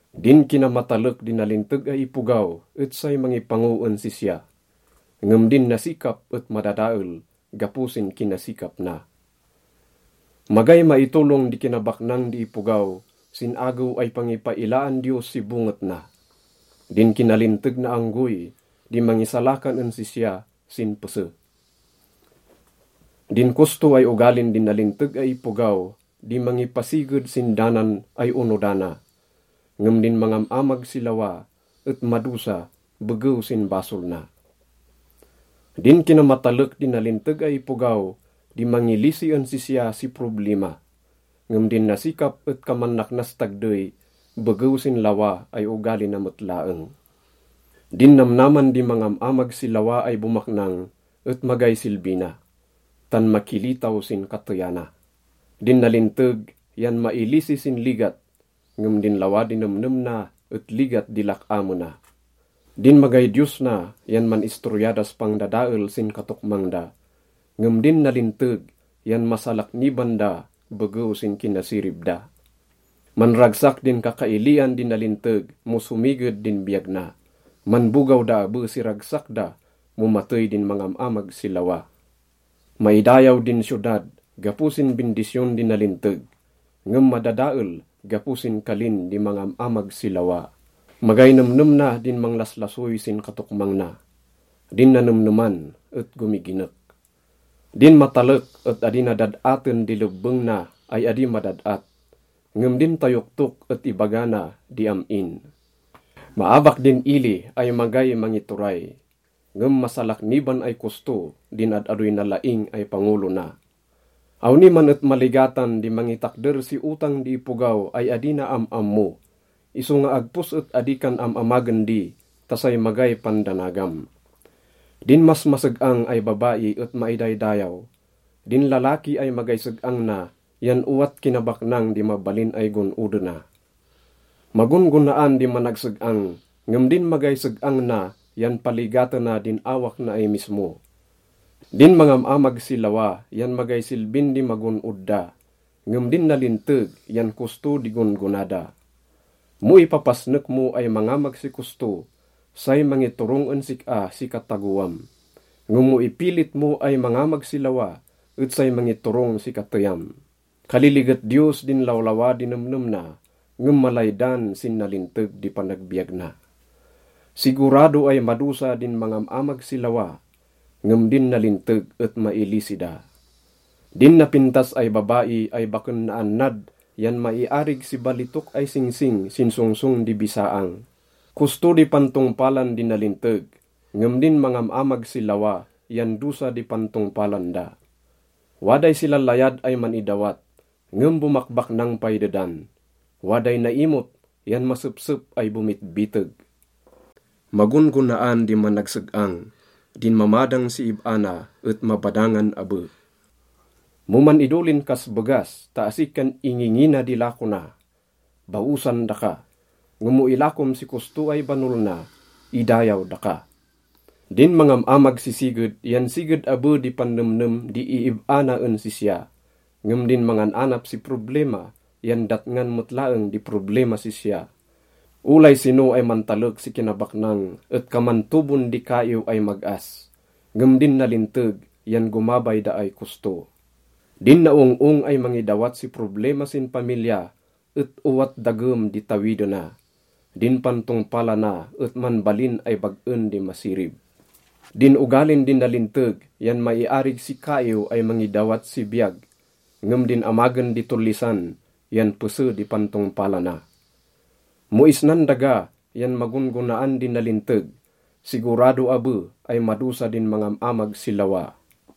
Din kinamatalek di nalinteg ay ipogaw et say mangipango en sisya, ngem din nasikap et madadael gapo sin kinasikap na. Magay maitolong di kinabaknang di ipogaw sin agew ay pangipailaan Diyos si bonget na. Din kinalinteg na anggoy di mangisalakan en sisya sin pese. Din kosto ay ogalin di nalinteg ay ipogaw di mangipasiged sin danan ay onodana, ngem din mangam-amag si lawa et madosa begew sin basol na. Din kinamatalek di nalinteg ay ipogaw di mangilisi en sisya si problima, ngem din nasikap et kaman naknas tagdey begew sin lawa ay ogali na met laeng. Din namnaman di mangam-amag si lawa ay bomaknang et magay silbi na, tan makilitaw sin kateyana. Din nalinteg yan mailisi sin ligat, ngem din lawa di nemnem na et ligat di lak-amena. Din magay Diyos na yan man-istorya das pangdadael sin katokmang da, ngem din nalinteg yan masalakniban da begew sin kinasirib da. Manragsak din kakailian di nalinteg mo somiged din biyag na. Manbogaw da abe si ragsak da mo matey din mangam-amag si lawa. Maidayaw din siyodad gapo sin bindisyon di nalinteg, ngem madadael gapo sin kalin di mangam-amag si lawa. Magay nemnem na din manglaslasoy sin katokmang na. Din nanemneman et gomiginek. Din matalek et adi na dad-aten di lebbeng na ay adi madad-at, ngem din tayoktok et ibaga na di am-in. Maabak din ili ay magay mangituray, ngem masalakniban ay kosto din ad-adoy nalaing ay pangolo na. Awni man et maligatan di mangitakder si otang di ipogaw ay adi na am-ammo, isonga agpos et adi kan am-amagen di ta say magay pandanagam. Din masmaseg-ang ay babai et maidaydayaw. Din lalaki ay magay seg-ang na yan owat kinabaknang di mabalin ay gon-odena. Magon-gonaan di managseg-ang, ngem din magay seg-ang na yan paligatena din awak na ay mismo. Din mangam-amag si lawa yan magay silbin di magon-od da, ngem din nalinteg yan kosto di gon-gona da. Mo ipapasnek mo ay mangamag si kosto, say mangiturong en sik-a si katagoam, ngem mo ipilit mo ay mangamag si lawa et say mangiturong si kateyam. Kaliliget Diyos din lawlawa di nemnem na, ngem malaydan sin nalinteg di panagbiyag na. Sigurado ay madosa din mangam-amag si lawa, ngem din nalinteg et mailisi da. Din napintas ay babai ay baken naannad yan maiarig si balitok ay singsing sin songsong di bisaang. Kosto di pantongpalan di nalinteg, ngem din mangam-amag si lawa yan dosa di pantongpalan da. Waday silalayad ay man-idawat, ngem bomakbaknang pay dedan. Waday naimot yan masepsep ay bomitbiteg. Magon-gonaan di managseg-ang. Din mamadang si ib-a na et mabadangan abe. Mo man-idolin kas begas ta asi kan ingingina di lako na, baosan daka, ngem mo ilakom si kosto ay banol na, idayaw daka. Din mangam-amag si siged yan siged abe di pannemnem di iib-a na en sisya, ngem din mangan-anap si problima yan datngan met laeng di problimas sisya. Olay sino ay mantalek si kinabaknang et kaman tobon di kaiw ay mag-as, ngem din nalinteg yan gomabay da ay kosto. Din naong-ong ay mangidawat si problima sin pamilya et owat dagem di tawidena. Din pantongpalana et manbalin ay bag-en di masirib. Din ogalin di nalinteg yan maiarig si kaiw ay mangidawat si biyag, ngem din amagen di tollisan yan pese di pantongpalana. Mo isnan daga yan magon-gonaan di nalinteg, sigurado abe ay madosa din mangam-amag si lawa.